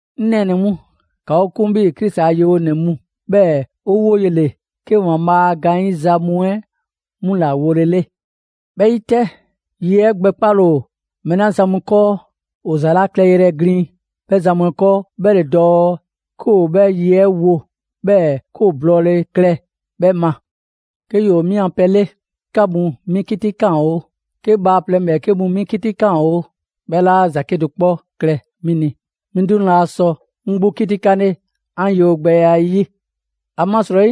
'Ŋ nɛɛnɛ‑ mu, ‑ka 'o 'kun 'bhii‑ Krisi a yewonɛ mu, 'bhɛɛ‑ ‑o woye ‑le 'ke ‑Waanbhaa' a gaanyiza mu 'ɛ 'mu ‑la wolele. 'Bhɛ 'yi 'tɛ, ye 'ɛ gbɛkpale ‑o mɛɛ 'la zan mu 'kɔɔ, ‑o ‑za 'la klɛyrɛ glin 'bhɛ zan mu 'ɛ 'kɔɔ 'bhɛ ‑le dɔɔ 'ke ‑o 'bhɛ ye 'ɛ wo, 'bhɛɛ‑ 'ke ‑o blɔɔle klɛ 'bhɛ ma. 'Ke ‑yoo 'mi 'an pɛ 'le, 'ke 'ka mu 'mi 'kitikaan oo, 'ke bhaaplɛŋ ‑bhɛɛke' mu 'mi 'kitikaan oo, 'bhɛ 'laa ‑za 'kedo‑ 'kpɔ klɛ 'mi ni. 'Mi 'duŋ‑ laa sɔ 'ŋ 'gbu 'kitikanle 'an yewogbɛya 'ɛ 'yi. ‑Amasrɔyi,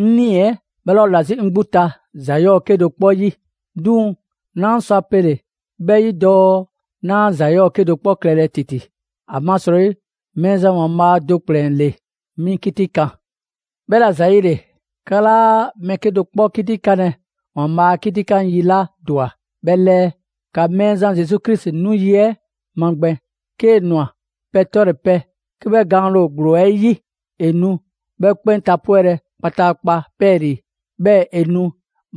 'ŋ 'nii‑ 'ɛ 'bhɛ 'laa ‑o ‑la 'zi 'ŋ 'gbu ta ‑za 'yɔɔ 'kedo‑ 'kpɔ 'yi. 'Duŋ‑ 'naa sɔ a pele‑ 'bhɛ 'yi dɔɔ 'naa ‑za 'yɔɔ‑ 'kedo‑ 'kpɔ klɛlɛ ‑titi; ‑amasrɔyi Mɛɛzan ‑Waanbhaa' do ‑kplɛn ‑le 'mi 'kitikan. 'Bhɛla‑ ‑zayile, 'ka 'laa mɛɛ 'kedo‑ 'kpɔ 'kitikanlɛ ‑Waanbhaa' 'kitikan yi 'la ‑dwa 'bhɛ 'lɛɛ. ‑Ka Mɛɛzan Zesu Krisi 'nu yi 'ɛ magbɛn. 'Kee‑ ‑nwa, pɛ 'tɔle‑ pɛ, 'ke 'bhɛ gaanle ‑o ‑gblo 'ɛ 'yi, ‑e nu 'bhɛ 'kpɛn tapwɛlɛ kpataakpa 'pɛɛlii‑; 'bhɛɛ‑ ‑e nu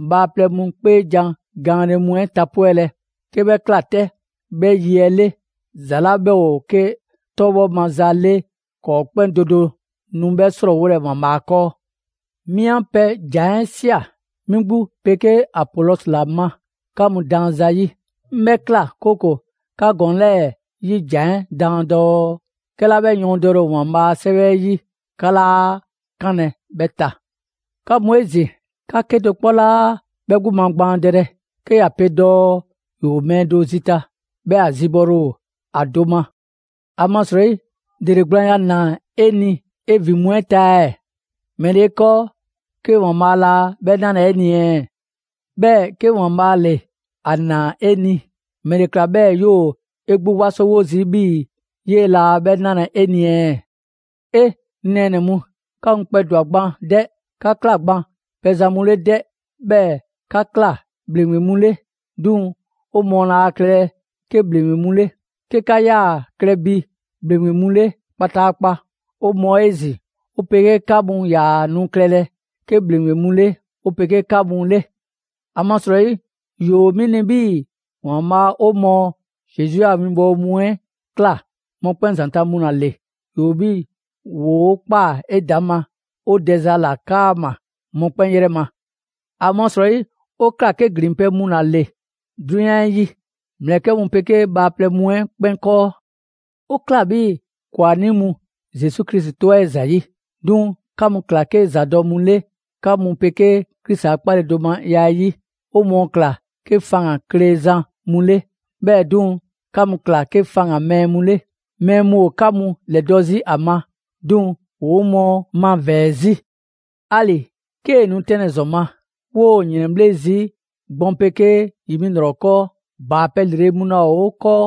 bhaaplɛŋ mu 'kpeejan‑ gaanle mu 'ɛ tapwɛlɛ. 'Ke 'bhɛ ꞊kla 'tɛ, 'bhɛ yi 'ɛ 'le, ‑za 'la 'bhɛ ‑o 'ke 'tɔbhɔ maza 'le ‑kɔɔ' 'kpɛn do do nu 'bhɛ 'srɔɔwolɛ ‑Waanbhaa' 'kɔɔ. 'Mi 'an pɛ ‑jan 'ɛ ꞊sia 'mi 'gbu 'pegee Apolɔsi ‑la ma 'ka mu daan zayi'. 'Ŋ 'bhɛ ꞊kla, 'kooko‑ 'ka ‑gɔɔn 'lɛɛ‑ 'bhɛ 'yi jan 'ɛ daan dɔɔ: «'Kɛla 'bhɛ yɔɔndɛle ‑o ‑Waanbhaa' a 'Sɛwɛ 'ɛ 'yi, 'ka 'laa 'kanlɛ‑ 'bhɛ ta». 'Ka mu 'ezin‑, 'ka 'kedo‑ 'kpɔ 'laa 'bhɛ 'gbu magbaandɛlɛ 'ke ‑ya pe dɔɔ ‑yoo mɛɛ do zita, 'bhɛɛ‑ ‑a zibɔle ‑o ‑a do ma. ‑Amasrɔyi, ‑dele gblaanya ‑naa 'e ni 'e ‑vin mu 'ɛ ta ɛɛ? ‑Mɛle 'e 'kɔɔ 'ke ‑Waanbhaa' laa 'bhɛ 'nalɛ‑ 'e ni ɛɛ? 'Bhɛɛ‑ 'ke ‑Waanbhaa' ‑le 'a ꞊naa 'e ni, ‑mɛla ma 'bhɛɛ‑ 'yoo‑ 'e 'gbu 'wasowo zii' 'bhii‑ 'yee‑ 'laa 'bhɛ 'nalɛ‑ 'e ni ɛɛ? 'E! 'Ŋ nɛɛnɛ‑ mu, 'ka mu kpɛdwa‑ gban 'dɛ! 'Ka ꞊kla gban pɛzan mu 'le 'dɛ! 'Bhɛɛ‑ 'ka ꞊kla ‑bhleŋgbe mu 'le, 'duŋ‑ 'o mɔɔ laa klɛlɛ 'ke ‑bhleŋgbe mu 'le. 'Ke 'ka 'yaa‑ klɛ bi ‑bhleŋgbe mu 'le kpataakpa, 'o mɔɔ 'ezin‑ 'o 'pegee 'ka mu 'yaa‑ nu klɛlɛ 'ke ‑bhleŋgbe mu 'le 'o 'pegee 'ka mu 'le. ‑Amasrɔyi, ‑yoo 'mi ni 'bhii‑ ‑Waanbhaa' 'o mɔɔ Zesu a winbɔwo mu 'ɛ ꞊kla mɔkpɛn' ‑zanta' mu ‑la ‑le: ‑yoo 'bhii‑ ‑woo' ꞊kpaa 'edaŋma 'o dɛza ‑la 'kaama‑ mɔkpɛn' 'yrɛ ma. ‑Amasrɔyi, 'o ꞊kla 'ke ‑glinpɛ' mu ‑la ‑le 'drunyan 'ɛ 'yi ‑mlɛkɛ' mu 'pegee bhaaplɛŋ mu 'ɛ 'kpɛn 'kɔɔ. 'O ꞊kla 'bhii‑ ‑kwanii' mu Zesu Krisi 'tɔ 'ɛ ‑zayi'; 'duŋ‑ 'ka mu ꞊kla 'ke ‑zadɔ' mu 'le 'ka mu 'pegee Krisi a 'kpaledomaya 'ɛ 'yi. 'O mɔɔ ꞊kla 'ke faŋgan‑ klezan mu 'le; 'bhɛɛ‑ 'duŋ‑, 'ka mu ꞊kla 'ke faŋgan‑ mɛɛ mu 'le. Mɛɛ mu ‑o 'ka mu ‑lɛdɔ' 'zi ‑a ma, 'duŋ‑ ‑woo 'o mɔɔ mavɛɛ‑ 'zi. 'Ali‑ 'kee‑ nu 'tɛnlɛ‑ ‑zɔn ma, 'woo‑ ‑yrɛnbhle' zii' gbɔn 'pegee ‑yi 'mi ‑lrɔ 'kɔɔ; ‑baapɛ' ‑lrele' mu laa ‑o 'o 'kɔɔ;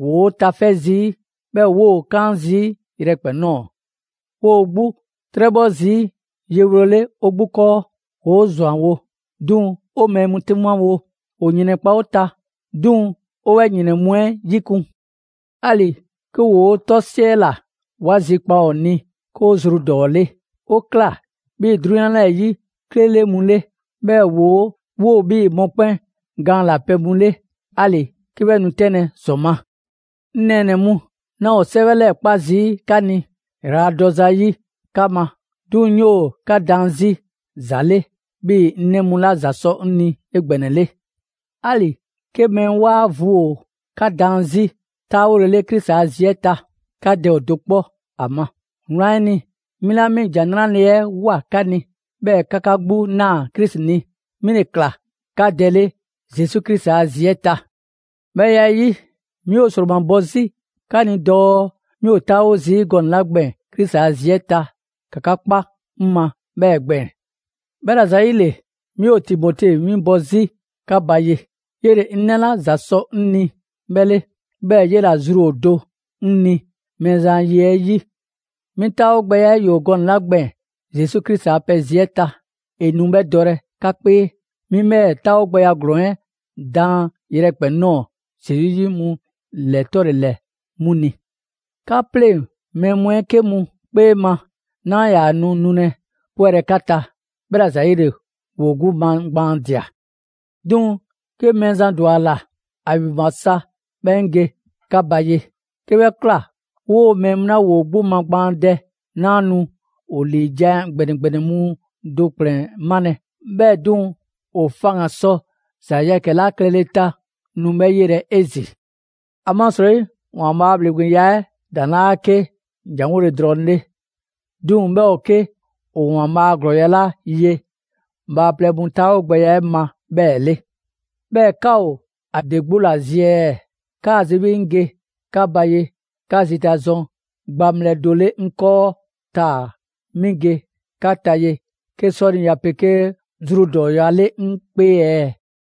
‑woo' tafɛ' zii', 'bhɛɛ‑ 'woo‑ 'kaan‑ zii' yrɛkpɛn‑ ꞊nɔɔ. 'Woo 'gbu 'trɛbhɔ zii' yewolele 'o 'gbu 'kɔɔ. ‑Woo' ‑zwanwo', 'duŋ‑ 'o mɛɛ mu 'dumawo; ‑o ‑yrɛnkpa' 'o ta, 'duŋ‑ 'o 'bhɛ ‑yrɛn mu 'ɛ 'yikun‑. 'Ali‑ 'ke ‑woo' 'tɔ 'siɛla‑, 'wa zikpa ‑o ni 'ke 'o zru ‑dɔɔ 'le. 'O ꞊kla 'bhii‑ 'drunyan 'yi 'klele mu 'le, 'bhɛɛ‑ 'woo‑ 'bhii‑ mɔkpɛn' gaan ‑la pɛ mu 'le, 'ali‑ 'ke 'bhɛ nu 'tɛnlɛ‑ ‑zɔn ma. 'Ŋ nɛɛnɛ‑ mu, 'naa ‑o 'sɛwɛ 'lɛɛ‑ 'kpa zii' 'ka ni ‑yraladɔ zayi' 'ka ma; 'duŋ‑ 'ŋ 'yoo‑ 'ka daan 'zi ‑za 'le 'bhii‑ 'ŋ 'nɛ mu 'la ‑za sɔ 'ŋ ni 'egbɛnɛle. 'Ali‑ 'ke mɛɛ 'waa vu ‑o 'ka daan 'zi 'taawolele Krisi a zi 'ɛ ta, 'ka dɛ ‑o do 'kpɔ ‑a ma. Wlan 'ɛ ni, 'mi 'la 'mi ‑Jan 'Nrale‑ 'ɛ ꞊woa 'ka ni, 'bhɛɛ‑ 'ka 'ka 'gbu ꞊naa Krisi ni, 'mi ‑le ꞊kla 'ka dɛ 'le Zesu Krisi a zi 'ɛ ta. 'Bhɛ ya 'ɛ 'yi, 'mi ‑o ‑sromabɔ 'zi 'ka ni dɔɔ 'mi ‑o 'taawo zii' gɔnɛ‑ 'la gbɛɛn‑ Krisi ‑a zi 'ɛ ta, ‑ka 'ka 'kpa 'ŋ ma 'bhɛɛ‑ gbɛɛn‑. 'Bhɛla‑ ‑zayile, 'mi ‑o Timote 'winbɔ‑ 'zi 'ka ba ye, 'yele‑ 'ŋ 'nɛ 'la ‑za sɔ 'ŋ ni 'bhɛ 'le, 'bhɛɛ‑ 'ye ‑la zru ‑o do 'ŋ ni Mɛɛzan a ye 'ɛ 'yi. 'Mi 'taawogbɛya 'ɛ ‑yoo gɔnɛ‑ 'la gbɛɛn‑ Zesu Krisi a pɛ zi 'ɛ ta, 'e nu 'bhɛ dɔlɛ 'ka 'kpee. 'Mi 'bhɛɛ‑ 'taawogbɛya ‑glɔɔn 'ɛ daan yrɛkpɛn‑ ꞊nɔɔ Zesu 'yi mu ‑lɛ 'tɔle‑ ‑lɛ 'mu ni. 'Ka 'pleŋ‑ mɛɛ mu 'ɛ 'ke mu 'kpee ma 'naa ‑yaa nu nulɛ 'pwɛlɛ‑ 'ka ta, 'bhɛla‑ ‑zayile ‑woo 'gbu magbaandia. 'Duŋ‑ 'ke Mɛɛzan ‑dwa ‑a ‑la, ‑a ‑vinbwa sa 'bhɛɛ‑ 'ŋ ge 'ka ba ye. 'Ke 'bhɛ ꞊kla, 'woo‑ mɛɛ mu 'la ‑woo 'gbu magbaandɛ, 'naa nu ‑o ‑liijan' ‑gbɛnɛ ‑gbɛnɛ mu do ‑kplɛn 'malɛ‑, 'bhɛɛ‑ 'duŋ‑, ‑o faŋgan‑ sɔ ‑za yɛkɛ‑ 'la klɛle ta 'ŋ nu 'bhɛ 'yelɛ‑ 'ezin‑. ‑Amasrɔyi ‑Waanbhaa' a ‑bhleŋgbeya 'ɛ ‑a ‑daŋ' 'laa 'ke ‑janwole drɔŋ 'le; 'duŋ‑ 'bhɛ ‑o 'ke ‑o ‑Waanbhaa' a ‑glɔɔya' 'la ye bhaaplɛŋ mu 'taawogbɛya 'ɛ ma 'bhɛɛ‑ 'le. 'Bhɛɛ‑ 'ka ‑o ‑a ‑de 'gbu ‑la zi ɛɛ? 'Kaa‑ zi 'bhii‑ 'ŋ ge 'ka ba ye 'ka zita zɔn gbaŋbhlɛ do 'le 'ŋ 'kɔɔ taa‑ 'mi ge 'ka ba ye 'ke 'sɔniya 'pegee zru ‑dɔɔya' 'le 'ŋ 'kpee ɛɛ?